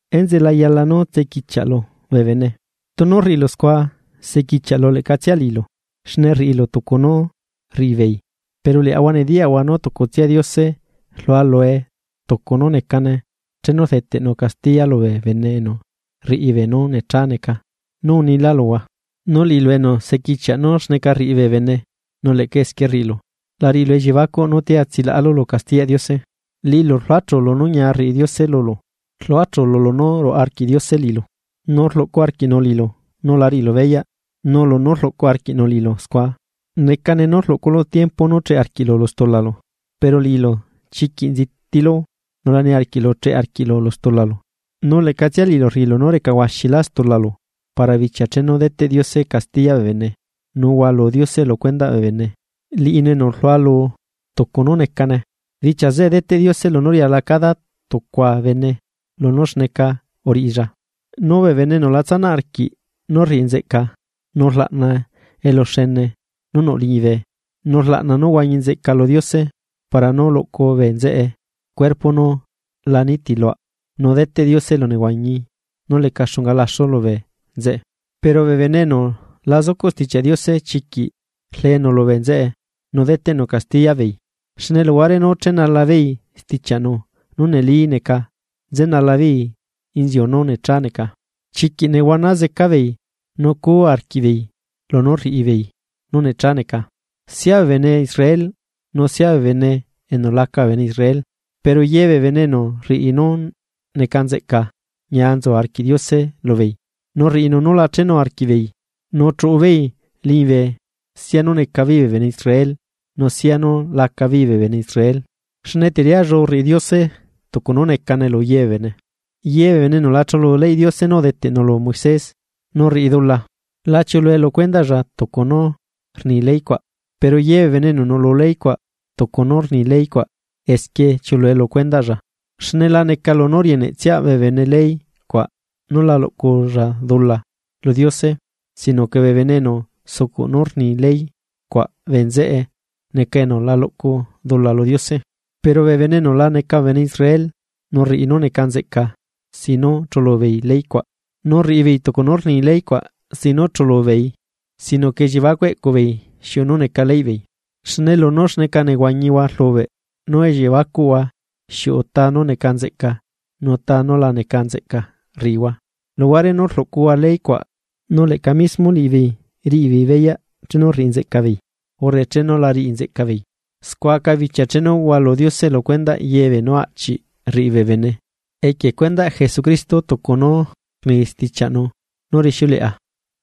Enzeꞌe la yala nú tsequichiaꞌlu bee bene, tunu rriꞌilu scua sequichiaꞌlu leꞌcatsia liꞌilu, xne rriꞌilu tucu nú rriꞌibeei. Pero liaꞌahua nediyaꞌahua nú tucutsia Diose rlualu tucu nú necane chenu rdeteꞌnu castiya lubee bene enu rriꞌi beenú necha neca, nú unila luhua. Nu liꞌilu enu sequichiaꞌ nú xneca rriꞌi bee bene nu leꞌca esquie rriꞌilu, la riꞌilu elliebacuꞌ nútia tsilaꞌalu lu castiyaꞌ Diose. Liꞌilu rluachulu nú ñia rriꞌi Diose lulu, rluachulu lunú ruaꞌa arquiꞌ Diose liꞌilu, nu rluꞌcu arquiꞌnu liꞌilu nu la riꞌilu beyaꞌ nú lunú rluꞌcu arquiꞌnu liꞌilu scua. necane nú rluꞌculu tiempo nú cheꞌe arquiꞌlu lu stulalu. Pero liꞌilu chiquiꞌ nzitilu nu la niarquiꞌlu cheꞌe arquiꞌlu lu stulalu, nu leꞌcatsia liꞌilu rriꞌilu nú recahuaxilá stulalu para bichia chenu deteꞌ Diose castiya bee bene nu hualu Diose lu cuendaꞌ bee bene liꞌinu enu rlualu tucu nú necane. Bichia zeꞌe deteꞌ Diose lunú riala cada tucua bene lunú xneca uriꞌilla. Nu bee bene enu la tsanaꞌ arquiꞌ nú rriꞌi nzeꞌca nu rlaꞌna eluxene nú nuꞌ liñibe, nu rlaꞌna nú huañi nzeꞌca lu Diose para nú luꞌcu bee nzeꞌe cuerpo nú la nitiluaꞌ nu deteꞌ Diose elunehuañi nú leca xunga laxu lubee nzeꞌe. Pero bee bene enu la zucuꞌ Stichiaꞌ Diose chiquiꞌ rlenu lubee nzeꞌe nu deteꞌnu castiya beei, xne luhuare nú chenalabeei stichiaꞌnu nú neli neca, nzenalabeei inziu nú necha neca. Chiquiꞌ nehuana zeca beei nu cuu arquiꞌbeei lunú rriꞌi beei nú necha neca, sia bee bene Israel nusia bee bene enu la neca bee bene Israel. Pero yebee bene enu rriꞌi nú neca nzeꞌca ñia nzu arquiꞌ Diose lubeei, nu rriꞌinu nú la chenu arquiꞌbeei nu chuꞌubeei liñibe, sia nú necabeei bee bene Israel nu sia nú lacabeei bee bene Israel. Xne teriallu rriꞌi Diose tucu nú necane luye bee bene. Yebee bene enu la chulu leyꞌ Diose nú udeteꞌnu lu Moisés nu rriꞌi dula, la chiulue lu cuendaꞌlla tucu nú rni ley cuaꞌ, pero ye bee bene enu nuꞌlu ley cuaꞌ, tucu nú rni ley cuaꞌ esquie chiuꞌulue lu cuendaꞌlla. Xne la neca lunú rieneꞌtsia bee bene ley cuaꞌ nú la luꞌculla dula lu Diose sino que bee bene enu sucuꞌ nú rni ley cuaꞌ bee nzeꞌe neca enu la luꞌcu dula lu Diose. Pero bee bene enu la neca bee bene Israel nu rriꞌi nú neca nzeꞌca sin nú chulubeei ley cuaꞌ, nu rriꞌibeei tucu nú rni ley cuaꞌ sin nú chulubeei, sino que elliebacuꞌ eꞌcubeei xiuꞌu nú neca leyꞌ beei, xne lunú xneca nehuañihua rlubeꞌ nú elliebacuꞌhua xiuꞌu ta nú neca nzeꞌca nu ta nú la neca nzeꞌca rriꞌihua, luhuare nú rluꞌcuhua ley cuaꞌ, nu leꞌca mismo liꞌibeei riꞌibeei beyaꞌ chenu rriꞌi nzeꞌcabeei urre chenu la riꞌi nzeꞌcabeei. Scua aca bichia chenu hualu Diose lu cuendaꞌ ye beenú aꞌchiꞌ rriꞌi bee bene equie cuendaꞌ Jesucristo tucu nú rni stichiaꞌnu nú rixiuleꞌa.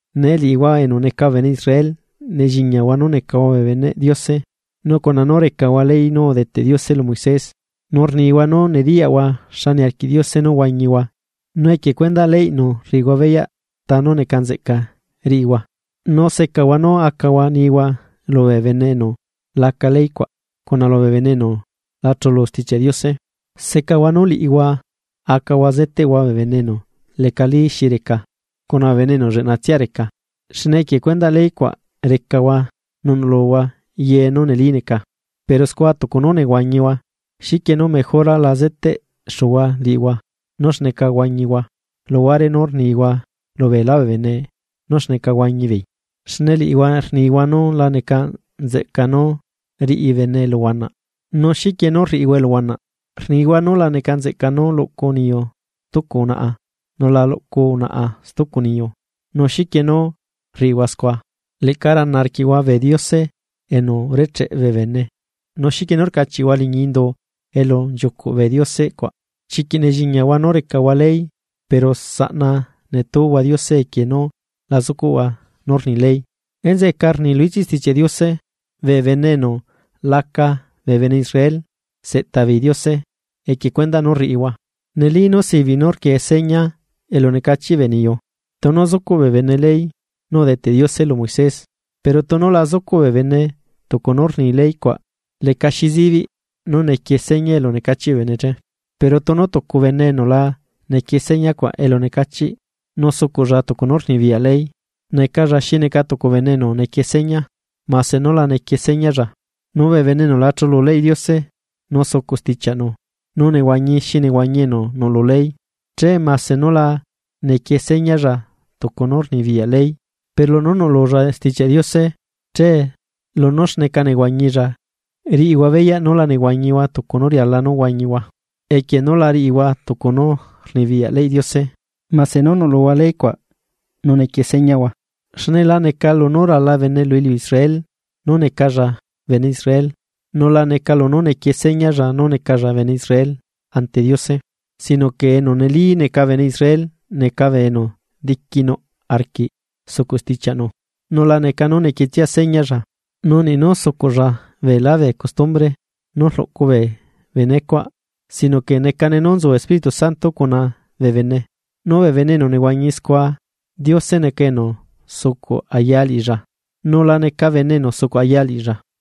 Nee liꞌihua enu neca bee bene Israel, nelliñiahua nú necahua bee beneꞌ Diose nu cuna nú recahua ley nú udeteꞌ Diose lu Moisés. Nu rnihua nú nediyaꞌhua xa niarquiꞌ Diose nú huañihua nu equie cuendaꞌ leyꞌnu rriꞌihua beyaꞌ ta nú neca nzeꞌca riꞌihua. Nu secahua nú acahua nihua lubee bene enu laca ley cuaꞌ, cuna lubee bene enu lachulu Stichiaꞌ Diose. Secahua nú liꞌihua acahua zeteꞌhua bee bene enu lecalí xi reca cuna bee bene enu lleꞌnatsia reca, xne equie cuendaꞌ ley cuaꞌ recahua nu nuꞌluhua ye nú neli neca. Pero scua tucu nú nehuañihua, ¿xiquienú mejora la zeteꞌxuhua liꞌihua nú xneca huañihua luhuare nú rnihua lubeelá bee bene nú xneca huañi beei? Xne liꞌihua rnihua nú la neca nzeꞌca nú riꞌi bene eluhuanaꞌ, ¿nu xiquie nú rriꞌihua eluhuanaꞌ? Rnihua nú la neca nzeꞌca nú luꞌcu niyu stucu unaꞌa nu la luꞌcu unaꞌa stucu niyu, ¿nu xiquie nú rriꞌihua scua? Leꞌca rana arquiꞌhua bee diose enu urecheꞌ bee bene nu, ¿xiquie nú rcachiꞌhua liñi indu elu nchiucuꞌ bee diose cuaꞌ? Chiquiꞌ nelliñiahua nú recahua ley pero saꞌna netúhua Diose equie nú la zucuꞌhua nú rni ley. Enzeꞌeca rni lu ichiꞌ Stichiaꞌ Diose: “Bee bene enu laca bee bene Israel seꞌta beei Diose equie cuendaꞌ nú rriꞌihua.” Neli nú sibiꞌ nú rquie seña elunecachiꞌ bee niyu, tunu zucuꞌ bee bene ley nú udeteꞌ Diose lu Moisés, pero tunu la zucuꞌ bee bene tucu nú rni ley cuaꞌ lecaxi zibiꞌ nú nequie seña elu necachiꞌ bee bene che. Pero tunu tucu bene enu la nequie señacuaꞌ elu necachiꞌ, nu sucuꞌlla tucu nú rnibiyaꞌ ley, necalla xi neca tucu bene enu nequie seña, mase nú la nequie señalla. Nu bee bene enu la chulu leyꞌ Diose nu sucuꞌ stichiaꞌnu nu nehuañi xi nehuañi enu nuꞌlu ley, che mase nú la nequie señalla tucu nú rnibiyaꞌ ley, pero lunú nuꞌlulla Stichiaꞌ Diose, che lunú xneca nehuañilla riꞌihua beyaꞌ nú la nehuañihua tucu nú riala nú huañihua, equie nú la riꞌihua tucu nú rnibiyaꞌ leyꞌ Diose mase nú nuꞌluhua ley cuaꞌ nu nequie señahua. Xne la neca lunú rala bene lu iliu Israel nú necalla bene Israel, nu la neca lunú nequie señalla nú necalla bene Israel ante Diose. Sino que enu neli neca bene Israel neca bee enu diquinuꞌ arquiꞌ sucuꞌ stichiaꞌnu nu la neca nú nequietsia señalla, nu niꞌ nú sucuꞌlla beelá bee custumbre nú rluꞌcu bee benecuaꞌ, sino que necane nú nzu Espíritu Santo cuna bee bene, nu bee bene enu nehuañi scua Diose neca enu sucuꞌ aya liꞌilla, nu la neca bene enu sucuꞌ aya liꞌilla.